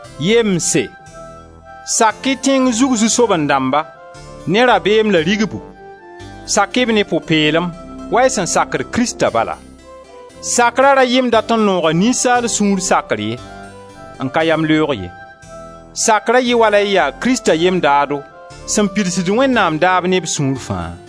Yemse, sak-y tẽng zug zu-soaben-dãmba, ne rabeem la rigbu, sak-y b ne pʋ-peelem, wa y sẽn sakd Krista bala. Sakra ra yɩ m dat n nooga ninsaal sũur sakr ye, n ka yamleoog ye; sakra yɩ wala y yaa Krista yem-daado, sẽn pidsd Wẽnnaam daab ne b sũur faa.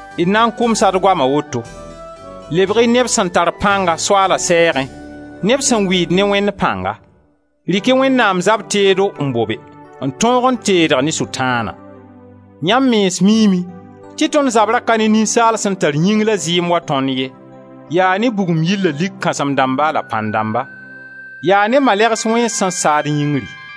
D na n kʋmsa d goama woto: lebg-y neb sẽn tar pãnga Soaala sɛɛgẽ, neb sẽn wɩɩd ne Wẽnd pãnga. Rɩk-y Wẽnnaam zab teedo n bobe, n tõog n teedg ne Sʋtãana. Yãmb mens miime tɩ tõnd zabra ka ne ninsaalb sẽn tar yĩng la zɩɩm wa tõnd ye, yaa ne bugum yir la lik kãsem-dãmba la pãn-dãmba, yaa ne malɛgs wẽns sẽn saad yĩngri.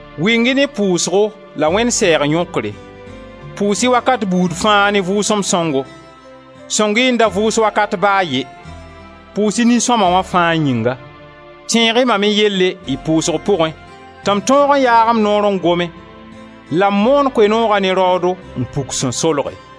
Wɩng-y ne pʋʋsgo la Wẽnd sɛɛg yõkre; pʋʋs-y wakat buud fãa ne Vʋʋsem Sõngo, sõng-y n da vʋʋs wakat ba a ye; pʋʋs-y nin-sõma wã fãa yĩnga. Tẽeg-y mam me yelle y pʋʋsg pʋgẽ tɩ m tõog n yaag m noore n gome la m moon Koe-nooga ne raoodo n puk sẽn solge.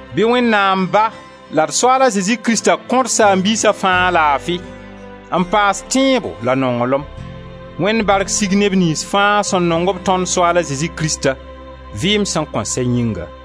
Bɩ Wẽnnaam Ba la d Soaala Zezi Krista kõ d saam-biisa fãa laafi, n paas tẽebo la nonglem! Wẽnd bark sig neb niyns fãa sẽn nong-b tõnd Soaala Zezi Krista, vɩɩm sẽn kõn sɛ yĩnga!